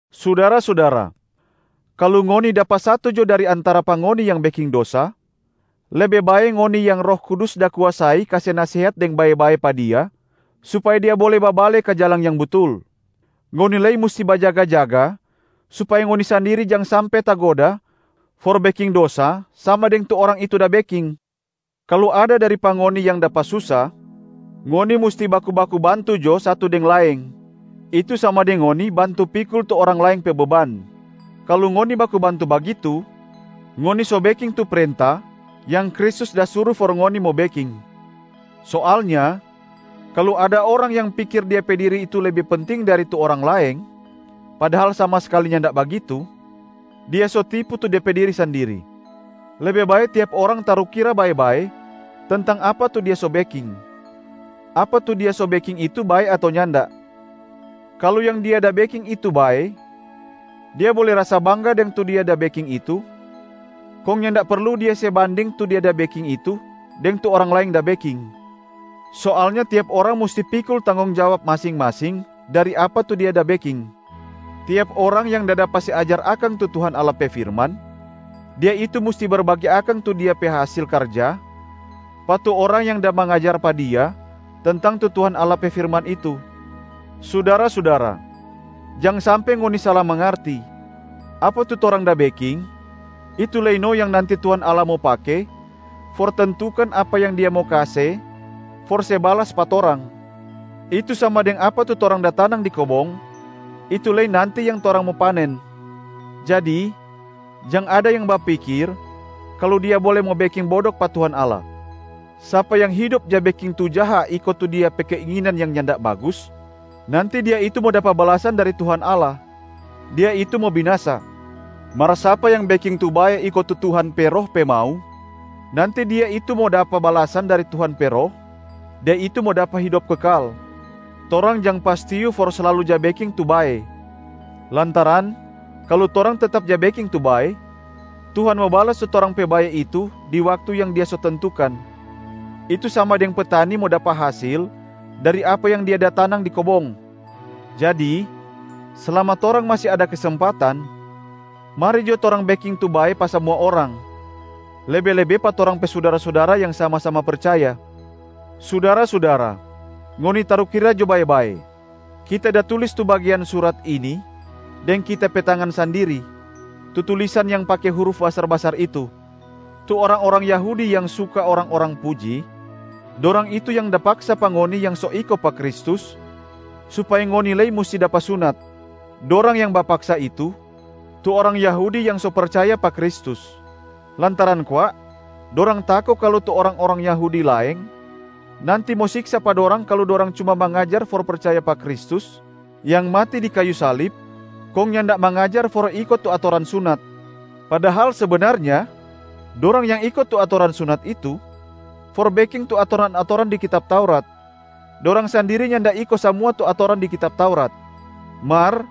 Sudara-sudara, kalu ngoni dapa satu jo dari antara pa ngoni yang beking dosa, lebe bae ngoni yang Roh Kudus da kuasai kase nasehat deng bae-bae pa dia supaya dia bole babale ka jalang yang butul. Ngoni lei musti bajaga-jaga supaya ngoni sandiri jang sampe tagoda for beking dosa sama deng tu orang itu da beking. Kalu ada dari pa ngoni yang dapa susa, ngoni musti baku-baku bantu jo satu deng laeng, itu sama deng ngoni bantu pikul tu orang laeng pe beban. Kalu ngoni baku bantu bagitu, ngoni so beking tu prenta yang Kristus da suru for ngoni mo beking. Soalnya kalu ada orang yang pikir dia pe diri itu lebe penting dari tu orang laeng padahal sama skali nyanda bagitu, dia so tipu tu de pe diri sandiri. Lebe bae tiap orang tarukira bae-bae tentang apa tu dia so beking, apa tu dia so beking itu bae ato nyanda. Kalu yang dia da beking itu bae, dia bole rasa bangga deng tu dia da beking itu, kong nyanda perlu dia se banding tu dia da beking itu deng tu orang laeng da beking. Soalnya tiap orang musti pikul tanggong jawab masing-masing dari apa tu dia da beking. Tiap orang yang da dapa se ajar akang tu Tuhan Allah pe firman, dia itu musti berbage akang tu dia pe hasil karja pa tu orang yang da mangajar pa dia tentang tu Tuhan Allah pe firman itu. Sudara-sudara, jang sampe ngoni sala mangarti: apa tu torang da beking, itu lei no yang nanti Tuhan Allah mo pake for tentukan apa yang Dia mo kase for se balas pa torang, itu sama deng apa tu torang da tanang di kobong, itu lei nanti yang torang mo panen. Jadi jang ada yang bapikir kalu dia bole mo beking bodok pa Tuhan Allah. Sapa yang hidop ja beking tu jaha iko tu dia pe keinginan yang nyanda bagus, nanti dia itu mo dapa balasan dari Tuhan Allah, dia itu mo binasa. Mar sapa yang beking tu bae iko tu Tuhan pe Roh pe mau, nanti dia itu mo dapa balasan dari Tuhan pe Roh, dia itu mo dapa hidop kekal. Torang jang pastiu for slalu ja beking tu bae, lantaran kalu torang tetap ja beking tu bae, Tuhan mo balas tu torang pe bae itu di waktu yang Dia so tentukan, itu sama deng petani mo dapa hasil dari apa yang dia da tanang di kobong. Jadi slama torang masi ada kesempatan, mari jo torang beking tu bae pa samua orang, lebe-lebe pa torang pe sudara-sudara yang sama-sama percaya. Sudara-sudara, ngoni tarukira jo bae-bae. Kita da tulis tu bagean surat ini deng kita pe tangan sandiri, tu tulisan yang pake huruf basar-basar itu. Tu orang-orang Yahudi yang suka orang-orang puji, dorang itu yang da paksa pa ngoni yang so iko pa Kristus supaya ngoni lei musti dapa sunat. Dorang yang bapaksa itu, tu orang Yahudi yang so percaya pa Kristus, lantaran kwa dorang tako kalu tu orang-orang Yahudi laeng nanti mo siksa pa dorang kalu dorang cuma mangajar for percaya pa Kristus yang mati di kayu salib kong nyanda mangajar for iko tu atoran sunat. Padahal sebenarnya, dorang yang iko tu atoran sunat itu for beking tu atoran-atoran di kitab Taurat, dorang sandiri nyanda iko samua tu atoran di kitab Taurat. Mar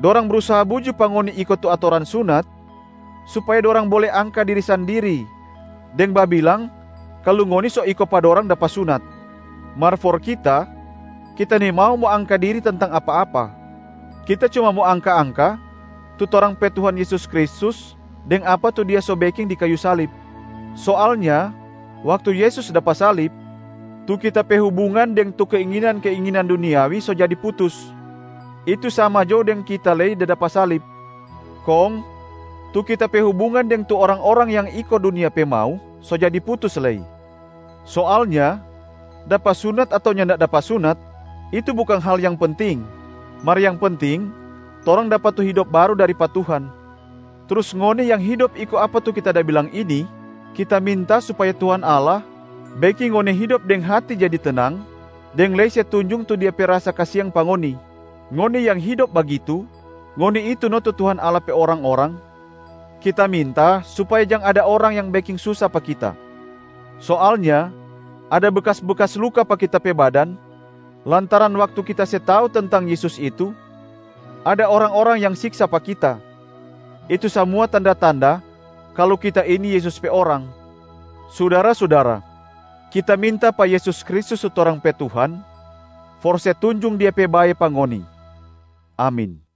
dorang brusaha buju pa ngoni iko tu atoran sunat supaya dorang bole angka diri sandiri deng babilang kalu ngoni so iko pa dorang dapa sunat. Mar for kita, kita nimau mo angka diri tentang apa-apa, kita cuma mo angka-angka tu torang pe Tuhan Yesus Kristus deng apa tu Dia so beking di kayu salib. Soalnya waktu Yesus dapa salib, tu kita pe hubungan deng tu keinginan-keinginan duniawi so jadi putus, itu sama jo deng kita lei da dapa salib. Kong tu kita pe hubungan deng tu orang-orang yang iko dunia pe mau so jadi putus lei. Soalnya dapa sunat ato nyanda dapa sunat, itu bukang hal yang penting. Mar yang penting, torang dapa tu hidop baru dari pa Tuhan. Trus ngoni yang hidop iko apa tu kita da bilang ini, kita minta supaya Tuhan Allah beking ngoni hidop deng hati jadi tenang deng lei se tunjung tu Dia pe rasa kasiang pa ngoni. Ngoni yang hidop bagitu, ngoni itu no tu Tuhan Allah pe orang-orang.a Kita minta supaya jang ada orang yang beking susa pa kita. Soalnya ada bekas-bekas luka pa kita pe badan lantaran waktu kita se tau tentang Yesus itu ada orang-orang yang siksa pa kita, itu samua tanda-tanda kalu kita ini Yesus pe orang. Sudara-sudara, kita minta pa Yesus Kristus tu torang pe Tuhan for se tunjung Dia pe bae pa ngoni. Amin.